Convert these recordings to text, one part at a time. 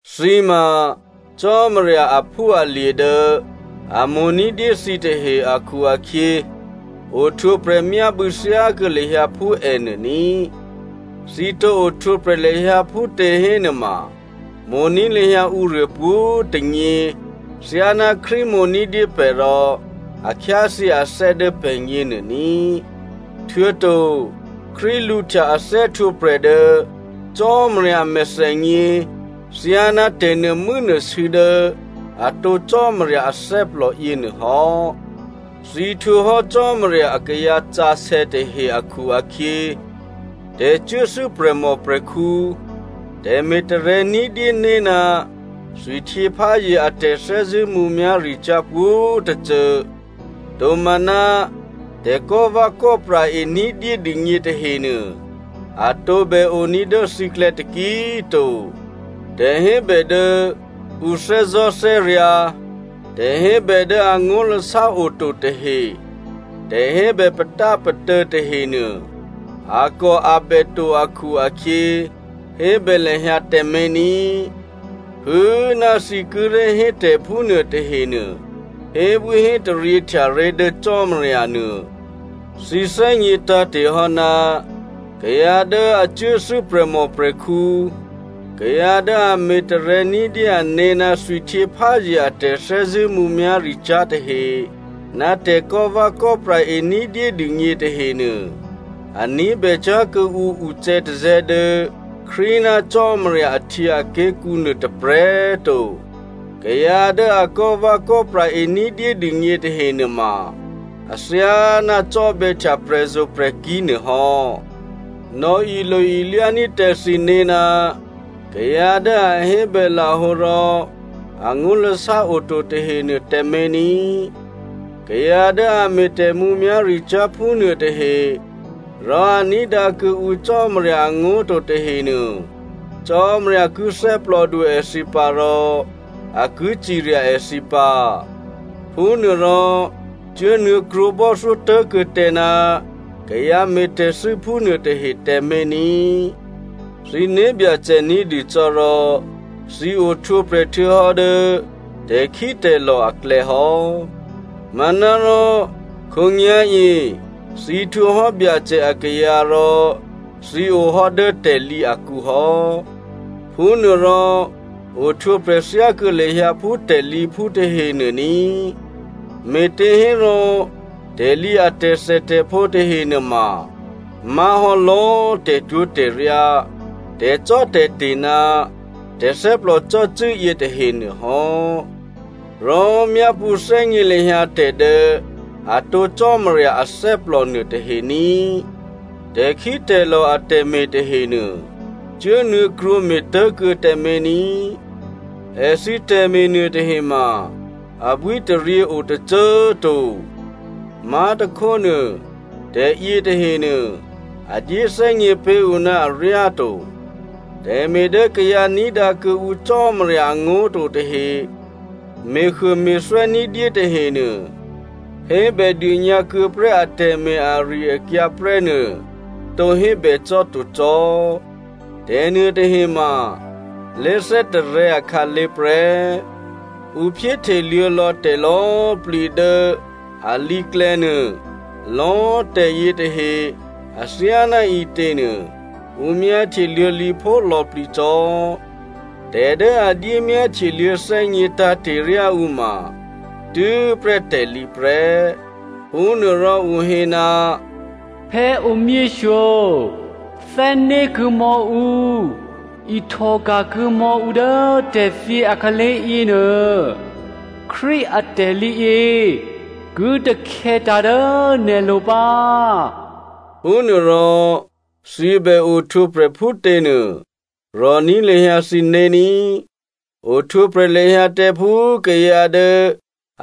Thǐ ma Cò́marya aphúalye̤ dố a mo̤ ní̤dyé thǐtahe akhu-akhyě, ohtwǒprè̤ myábû̌ thyákuô̌ lahyǎ phú ènuô ní꤮. Thǐ tǒ ohtwǒprè̤ lahyǎ phútě hénuôma, mo̤ní̤ lahyǎ ǔruô pwǒ̤꤮ tônyě thyáná Krístu mo̤ ní̤dyé pè̤ rò a khyáthyě athè́ dố pè̤gně nuô ní꤮. Htuô̌to Krístu lǔhtya a thè́htwǒprè̤ dố Cò́marya a mèthènyě thyáná tè̤nuô̤mû́nuô̤sû̌ dố atǒ Cò́marya athè́plò yěnuô hò́. Thǐ htwǒhò́ Cò́marya akayǎ sǎsè̌ tahe akhu-akhyě, tè̤cuốthû́ prè̤mòprè̤khǔ, tè̤me̤ tarè̤̌ ní̤dyéné̤ ná thwihtyěpházye a tè̤thè́zṳ̂́ mǔmyá̤ricyá̤ pwǒ̤tôcô, tomaná tè̤kò́vè̌kò́pra e ní̤dyé dûgně tahenuô, a tǒbè oní̤ dố thǐklè̌ taki꤮ to. Tè̤hébè dố ǔ thè́zò̤́thè́ryǎ̤, tè̤hébè dố angó̤lasá oto tahe, tè̤hébè patápatô̌ tahenuô, akòabè to akhu-akhyě hébè lahyǎ tǎmé̤ ní꤮. Phû꤮ ná thǐ kíré̤ hétè̤ phúnuô tahenuô hébwíhétaryě htyaré̤ dố Cò́marya nuô. Thǐ thè́gně tǎ̤te̤hò́ ná kayǎ dố a cuốthû́ prè̤mòprè̤khǔ, kayǎ dố a me̤tarè̤̌ ní̤dyé ané̤ ná thwihtyěpházye a tè̤thè́zṳ̂́ mǔmyá̤ricyá̤ tahe, ná tè̤kò́vè̌kò́pra e ní̤dyédûgně tahenuô, a ní̤bècyá̤ kuô̌ǔ ucè̌tazè̌ dố Krístu ná Cò́marya ahtyěaké̤kǔ nuô tôprè̤꤮ to. Kayǎ dố a kò́vè̌kò́pra e ní̤dyédûgně tahe nuôma athyáná cò́bè̌htya prè̤zo̤prè̤kí̤ nuôhò́. Nò̌ilo-ilyání̤ tǎ thǐné̤ ná kayǎ dố a hébèlahǒ rò angó̤lasá oto tahenuô tǎmé̤ ní꤮. Kayǎ dố a me̤ tè̤mǔmyá̤ricyá̤ phúnuô tahe, rò a ní̤dǎ kuô̌ ǔ Cò́marya angó̤ to tahenuô, Cò́marya ki thè́plòdu èthǐ pǎ rò a ki cirya èthǐ pǎ. Phúnuôrò, cuốnuô̌ krwǒbò́thyó tố̤kuô̌ tǎ ná kayǎ me̤tè̤thû́ phúnuô tahe tǎmé̤ ní꤮. Thǐ né̤byacè ní̤dû cò́ rò thǐ ohtwǒprè̤ htuô̌hò́ dố tè̤khítè̤lò̤ aklè̌ hò́. Manárò khǒnyá̤yě thǐ htwǒhò́ Byacè akayǎ rò thǐ ohò́ dố tè̤lǐ akǔ hò́. Phúnuôrò ohtwǒprè̤ thyákuô̌ lahyǎ phú tè̤lǐphú tahenuô ní꤮. Me̤těhérò, tè̤lǐ a tè̤thètè̤phǒ tahe nuôma má̤hò́ lò̌꤮ tè̤twó̤tè̤ryá, tè̤cò́tè̤te̤ ná tè̤thè́plò cò́cû́ yětahe nuôhò́. Rò myápṳ̌ thè́gně lahyǎ tè̤ dố atǒ Cò́marya athè́plò nuôtahe ní꤮. Tè̤khítè̤lò̤ atè̤me̤ tahenuô cuốnuô̌krwǒ me̤tố̤kuô̌ tǎmé̤ ní꤮. Èthǐ tè̤me̤ nuôtahe ma abwítaryě o tôcô꤮ to. Má̤tôkhónuô, tè̤ yětahenuô a dyéthè́gně pé̤ ǔ ná aryáto. Tè̤me̤ dố kayǎ ní̤dǎ kuô̌ǔ Cò́marya angó̤ to tahe me̤huôme̤thwè́ ní̤dyé tahenuô, hébèdônyǎ kuô̌ prè́ atè̤me̤ ari-akyǎ prè́nuô tǒ hébè cò́ to cò́. Tè̤nuôtahe ma lé̤thè́tarè̤̌ akhǎlé̤ prè́. Ǔ phyéhteluô̌ lò̌ tè̤lò̌꤮ plǐ dố alǐklè̌ nuô, lò̌꤮ tè̤yětahe, athyáná ǐtěnuô ǔ myáhtye luô̌lǐphó lò̌plǐcò́. Tè̤ dố a dyé myáhtyeluô̌ thè́gně tǎ̤te̤ ryá ǔ ma tû́prè́ tè̤lǐ prè́. Phúnuôrò ǔ hé, “Phè̌ omyěshyo, thè́né̤kuô̌ mò̌ ǔ, ihtòka̤ kuô̌mò̌ǔ dố tè̤thyě a khǎlé̤yě nuô. Krístu a tè̤lǐyě ki takhè̌tǎ̤ dố nè̤lo̤ pǎ.” Phúnuôrò, thǐ bè ohtwǒprè̤ phútěnuô, rò̤ní̤ lahyǎ thǐné̤ ní꤮. Ohtwǒprè̤ lahyǎ tǎ phú kayǎ dố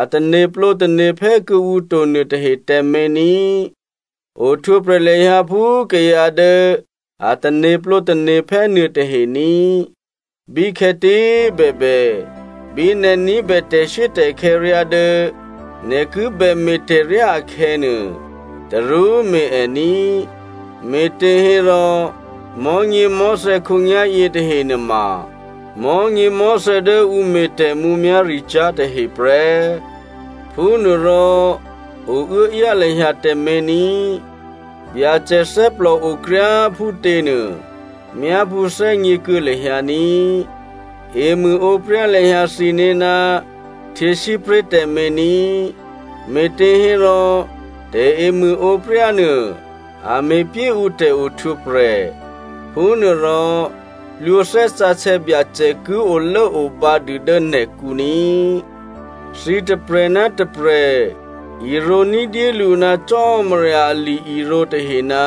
a tane̤plǒ tane̤phè́ kuô̌ǔ to nuôtahe tǎmé̤ ní꤮. Ohtwǒprè̤ lahyǎ phú kayǎ dố a tane̤plǒ tane̤phè́ nuôtahe ní꤮. Bíkhè̌tě꤮ bèbè, bí nè̤ ní̤bè tè̤shuốtè̤khè̌ ryá dố nè̤ ki bème̤ tè̤ryá akhè̌nuô, tarú me̤ è ní꤮, me̤těhérò mò̤́nyěmò̤́thè̌ khǒnyá̤ yětahe nuôma mò̤́nyěmò̤́thè̌ dố ǔ me̤ tè̤mǔmyá̤ricyá̤ tahe prè́. Phúnuôrò o uốáyá lahyǎ tǎmé̤ ní꤮. Byacè thè́plòo kryá꤮ phútěnuô myápṳ̌ thè́gněkuô̌ lahyǎ ní꤮. Emṳ̂ǒpryá lahyǎ thǐné̤ ná htyěsípré̤ tǎmé̤ ní꤮, me̤těhérò tè̤emṳ̂ǒpryá nuô a me̤pyé ǔ tè̤ohtwǒprè̤. Phúnuôrò plwǒ Thè́ Sǎsè̌ Byacè ki olốobǎ dû dố nè̤kǔ ní꤮. Thǐ tôprè̤ ná tôprè̤ irǒ ní̤dyélǔ ná Cò́marya ali-irǒ tahe ná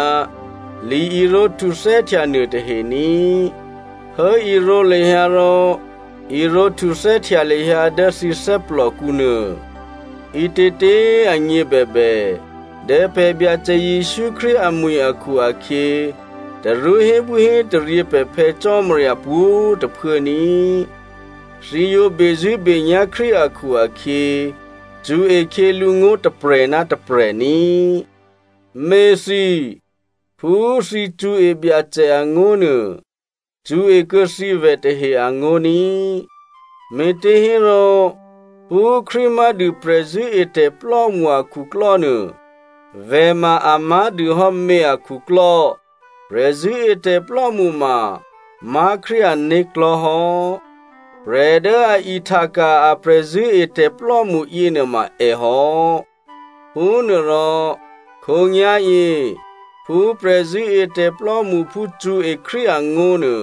li-irǒ htuthè́htya nuôtahe ní꤮. Hố irǒ lahyǎ rò irǒ htuthè́htya lahyǎ dố thǐ thè́plòkǔ nuô. Ǐtětě꤮ agně bèbè, dố pè̤ Byacè Jesǔ Krístu amwi̤ akhu-akhyě, tarú hébwíhétaryě pè̤ Phè̌ Cò́marya pwǒ̤꤮ tôphuố ní꤮. Thǐ yǒ bezṳ̂́benyá̤ Krístu akhu-akhyě, cṳ̌e khyělǔ ngó̤ tôprè̤ ná tôprè̤ ní꤮. Měthǐ꤮, phú thǐ cṳ̌e Byacè angó̤ nuô, cṳ̌e kuô̌ thǐ vè̤tahe angó̤ ní꤮. Me̤těhérò, phú Krístu má̤dû prè̤zṳ̂́etè̤plò́mṳ akhuklò́ nuô, vè̤ ma a má̤ dûhò́ mě akhuklò́. Prè̤zṳ̂́etè̤plò́mṳ ma má̤ Krístu ané̤klò̤́ hò́. Prè̤ dố a ihtaka̤ a prè̤zṳ̂́etè̤plò́mṳ yěnuôma èhò́. Phúnuôrò, khǒnyá̤yě phú prè̤zṳ̂́etè̤ plò́mṳphú cṳ̌e Krístu angó̤nuô,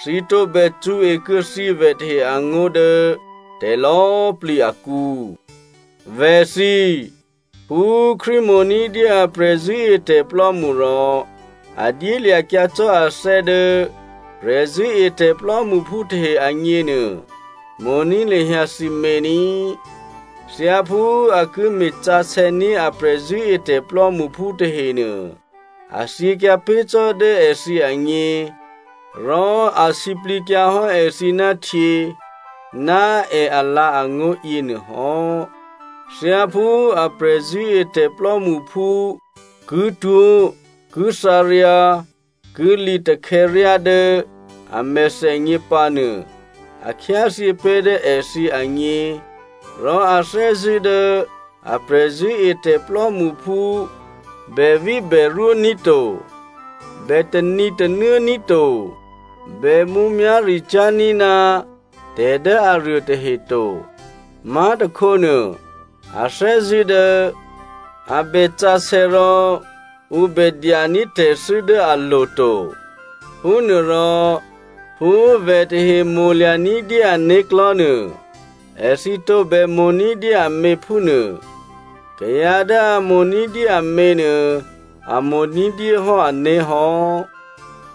thǐ tǒbè cṳ̌ekuô̌ thǐvè̤ tahe angó̤ dố tè̤lò̌꤮ plǐ akǔ. Vè̤thǐ꤮, phú Krístu mo̤ ní̤dyé a prè̤zṳ̂́etè̤plò́mṳ rò a dyélya̤kyǎ cò́ athè́ dố prè̤zṳ̂́etè̤ plò́mṳphú tahe agněnuô, mo̤ní̤ lahyǎ thǐmě ní꤮. Thyáphú a ki me̤sǎsè̌ní̤ a prè̤zṳ̂́etè̤ plò́mṳphú tahenuô, a thyěkyǎ pé̤ cò́ dố èthǐ agně, rò a sǐplǐkyǎhò́ èthǐ ná htyě ná è alǎ̤angó̤ yěnuôhò́. Thyáphú a prè̤zṳ̂́etè̤ plò́mṳphú ki twó̤ ki thǎryǎ ki lǐtakhè̌ryá dố a mèthènyě pǎnuô, a khyáthyě pé̤ dố èthǐ agně, rò a thè́zṳ̂́ dố a prè̤zṳ̂́etè̤ plò́mṳphú, bèvíbèrwǒ̤ ní̤ to. Bè tanǐtanuố ní̤ to, bè mǔmyá̤ricyá̤ ní̤ ná tè̤ dố aruô tahe to. Má̤tôkhónuô, a thè́zṳ̂́ dố a bè sǎsè̌ rò ǔ bè dyaní̤ tè̤thû́ dố alo̤ to. Phúnuôrò, phú꤮ vè̤ tahe mo̤lya̤ ní̤dyé ané̤klò̤́ nuô, èthǐ tǒbè mo̤ ní̤dyé amě phúnuô. Kayǎ dố a mo̤ ní̤dyé amě nuô a mo̤ ní̤dyé hò́ ané̤hò́.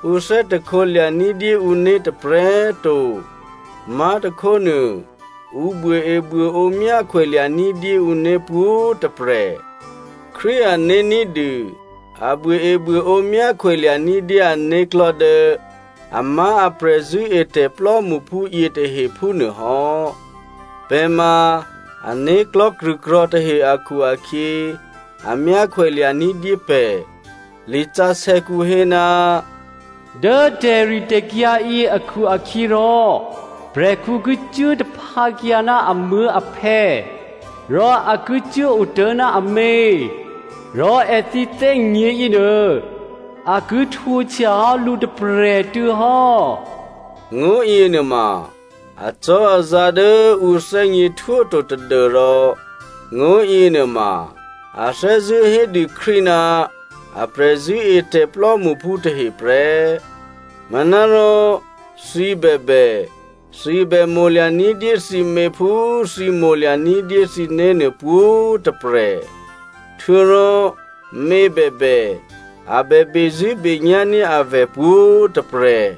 Ǔ thè́hte lya̤ ní̤dyé ǔné̤ tôprè̤꤮ to. Má̤tôkhónuô, ǔ buôebuôǒ myákhwè lya̤ ní̤dyé ǔné̤ pwǒ̤꤮ tôprè̤. Krístu ané̤ ní̤dû a buôebuôǒ myákhwè lya̤ní̤ dyé ané̤klò̤́ dố amá̤ a prè̤zṳ̂́etè̤ plò́mṳphú yětahe phúnuôhò́. Pè̤ ma ané̤klò̤́ krṳ̂krò̤̌ tahe akhu-akhyě a myákhwè lya̤ ní̤dyé pè̤. Lisǎsè̌kǔ hé, “Dố tè̤ritè̤kyǎ yě akhu-akhyěrò, prè̤khǔ ki cuố taphǎkyǎ ná amuố̤aphè̌ rò a ki cuốotố̤ ná amě. Rò èthǐ thè́gně yěnuô a ki htwǒhtya hò́ lǔ tôprè̤꤮ tuô̌ hò́.” Ngó̤ yěnuôma acò́azǎ̤ dố ǔ thè́gněhtwó to, tadû́rò ngó̤ yěnuôma a thè́zṳ̂́ hédû Krístu ná a prè̤zṳ̂́etè̤ plò́mṳphú tahe prè́. Manárò, thǐ bèbè, thǐ bè mo̤lya̤ ní̤dyé thǐmě phú thǐ mo̤lya̤ ní̤dyé thǐné̤nuô pwǒ̤꤮ tôprè̤. Htuô̌rò mě bèbè, a bè bezṳ̂́benyá̤ ní̤ avè̤ pwǒ̤꤮ tôprè̤.